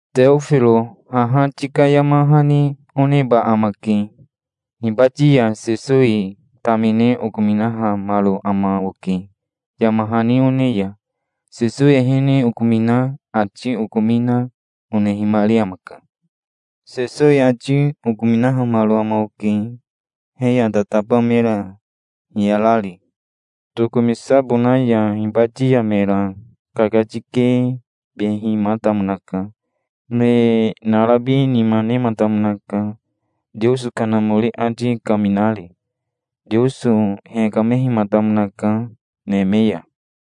Teofiro haha tika yama hani oneba amake. Hibati ya Sesowi tamine okominahamaro ama oke, yama hani one ya. Sesowi ehene okomina, ati okomina, onehimari amaka. Sesowi ati okominahamaro ama oke, he ya tataba mera hiyarari, tokomisabona ya. Hibati ya mera kakatikibehimatamonaka. Me narabi nima nematamonaka, Teoso Kanamori ati kaminari. Teoso hekamehimatamonaka, neme ya.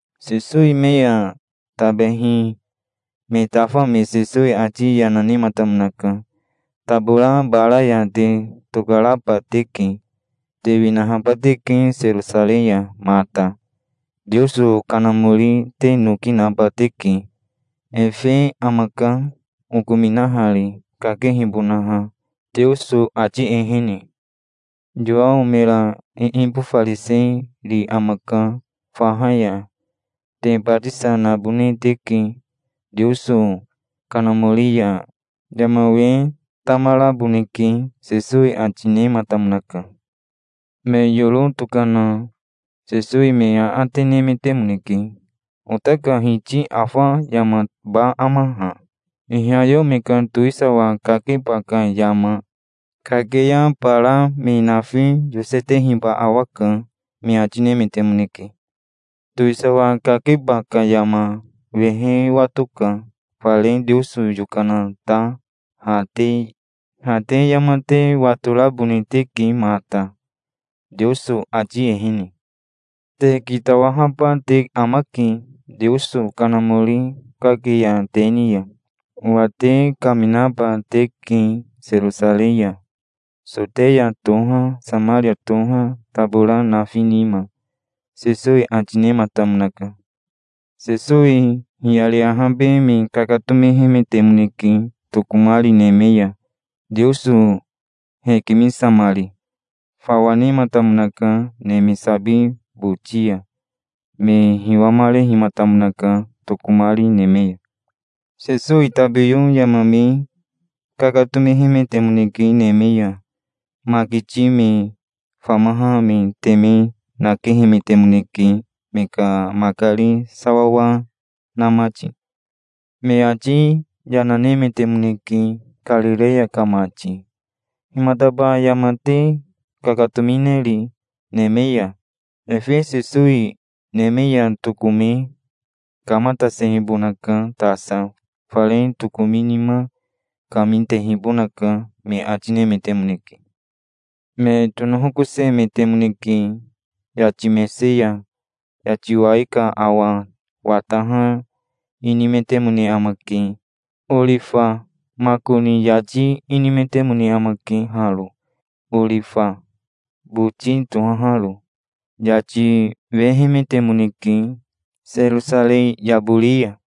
Sesowi me ya tabehi me tafa me Sesowi ati yana nematamonaka. "Tabora bara ya te tokaraba teke. Te winahaba teke Serosarei ya mata. Teoso Kanamori te noki naba teke. Efe amaka, okominahari, kakehibonaha, Teoso ati ehene. Yowao mera iibofariseri amaka faha ya. Te batisa nabone teke Teoso Kanamori ya. Yama we tamaraboneke", Sesowi ati nematamonaka. Me yoro tokana Sesowi me aate nemetemoneke. "Ota ka Hiti afa yamaba ama ha, ihayeo me ka towisawa kakeba ka yama? Kake ya bara me nafi yosetehiba awaka", me ati nemetemoneke. "Towisawa kakeba ka yama wehe watoka, fare Teoso yokana ta. Ha te yama te watorabone teke mata, Teoso ati ehene. Te kitawahaba te amake, Teoso Kanamori kake ya te ni ya. Owa te kaminaba teke Serosarei ya. Soteya toha, Samaria toha, tabora nafi nima", Sesowi ati nematamonaka. Sesowi hiyari ahabe me kakatomehemetemoneke tokomari neme ya, Teoso hekimisamari. Fawa nematamonaka neme sabi boti ya. Me hiwamarehimatamonaka tokomari neme ya. Sesowi tabiyo yama me kakatomehemetemoneke neme ya. Makiti me famaha me teme nakehemetemoneke, me ka makari sawawa na mati. Me ati yana nemetemoneke. "Karireya ka mati himataba yama te kakatomineri neme ya? Efe Sesowi neme ya tokome kamatasehibonaka tasa. Fare tokomi nima kami tehibonaka", me ati nemetemoneke. Me tonohokosemetemoneke yati mese ya. Yati wai ka awa wataha inimetemone amake orifa makoni yati inimetemone amake haro, orifa boti tohaharo. Yati wehemetemoneke Serosarei yabori ya.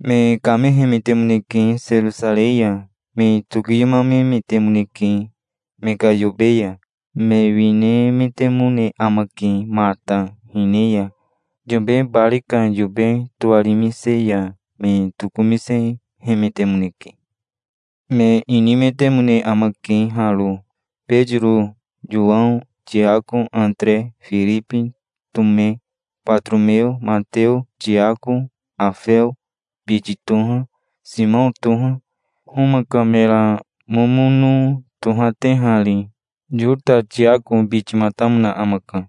Me kamehemetemoneke Serosarei ya. Me tokiyomamemetemoneke me ka yobe ya. Me winehemetemoneke mata. Yobe bari ka yobe towarimise ya me tokomisehemetemoneke. Me inimetemone amake haro. Betiro, Yowao, Tiako, Atere, Firibi, Tome, Batoromeo, Mateo, Tiako Afeo biti toha, Simao toha, Homa ka mera momono tohatehari. Yota Tiako bitimatamona amaka.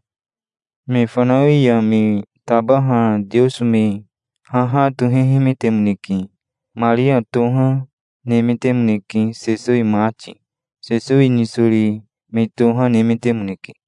Me fanawi ya me tabaha Teoso me haha tohehemetemoneke. Maria toha nemetemoneke, Sesowi mati. Sesowi nisori me toha nemetemoneke.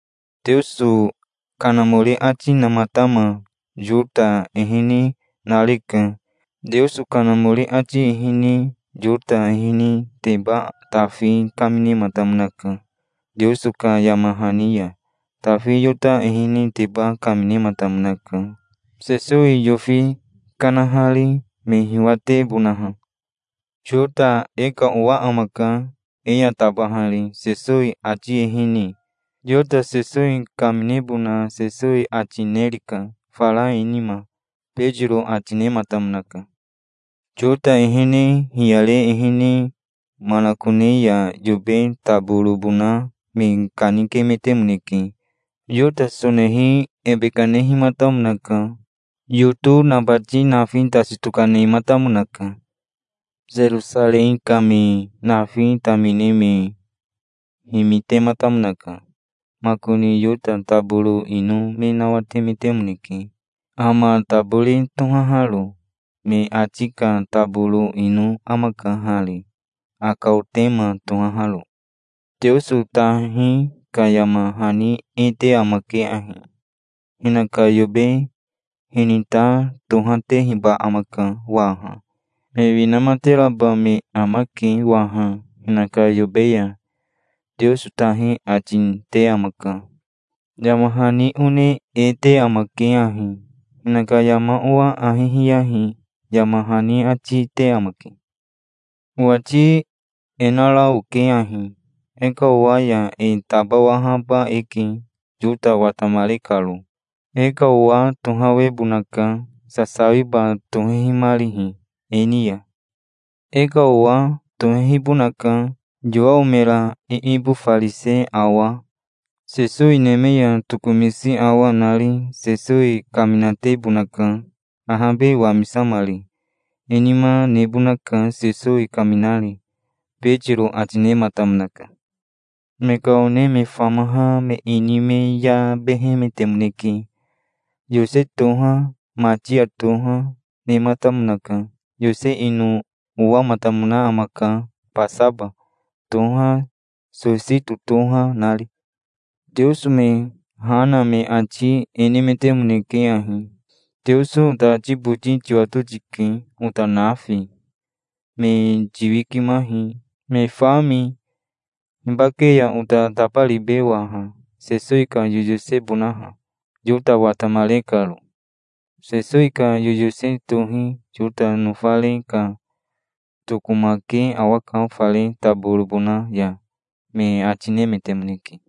"Teoso Kanamori ati namatama Yota ehene nareka. Teoso Kanamori ati ehene Yota eheneteba Tafi kaminematamonaka Teoso ka yama hani ya. Tafi Yota eheneteba kaminematamonaka, Sesowi yofi kanahari, me hiwatebonaha. Yota e ka owa amaka, e ya tabahari, Sesowi ati ehene. Yota Sesowi kaminebona Sesowi ati nerika, fara e nima", Betiro ati nematamonaka. (Yota ehene hiyare ehene manakone ya yobe taborobona me kanikemetemoneke. Yota sonehi ebe kanehimatamonaka. Yoto nabati nafi tasi tokanematamonaka. Serosarei ka me nafi tamine me himitematamonaka. Makoni Yota taboro ino me nawatemetemoneke, Ama Tabori tohaharo. Me ati ka taboro ino amaka hari, Akaotema tohaharo.) "Teoso tahi ka yama hani e te amake ahi: 'Hinaka yobe hinita tohatehiba amaka waha. Me winamateraba me amake waha hinaka yobe ya', Teoso tahi ati te amaka. Yama hani one e te amake ahi: 'Hinaka yama owa ahi hiyahi', yama hani ati te amake. Owati e nara oke ahi: E ka owa ya e tabawahaba eke, Yota watamare karo. E ka owa tohawebonaka, sasawiba tohehimarihi e ni ya. E ka owa tohehibonaka, Yowao mera iibofarise awa, Sesowi neme ya tokomisi awa, nari. Sesowi kaminatebonaka, ahabe wamisamari. E nima, nebonaka, Sesowi kaminari", Betiro ati nematamonaka. Me ka one me famaha me ini me yabehemetemoneke. Yose toha, Matia toha, nematamonaka. Yose ino owamatamona amaka Basaba toha Sosito toha nari. Teoso me ha na me ati e nemetemoneke ahi: "Teoso ota ati boti tiwato tike, ota nafi. Me tiwikimahi, me fami. Hibake ya ota tabaribe waha, Sesowi ka yoyosebonaha, Yota watamare karo? Sesowi ka yoyose tohi Yota nofare ka tokomake awaka fare taborobona ya", me ati nemetemoneke.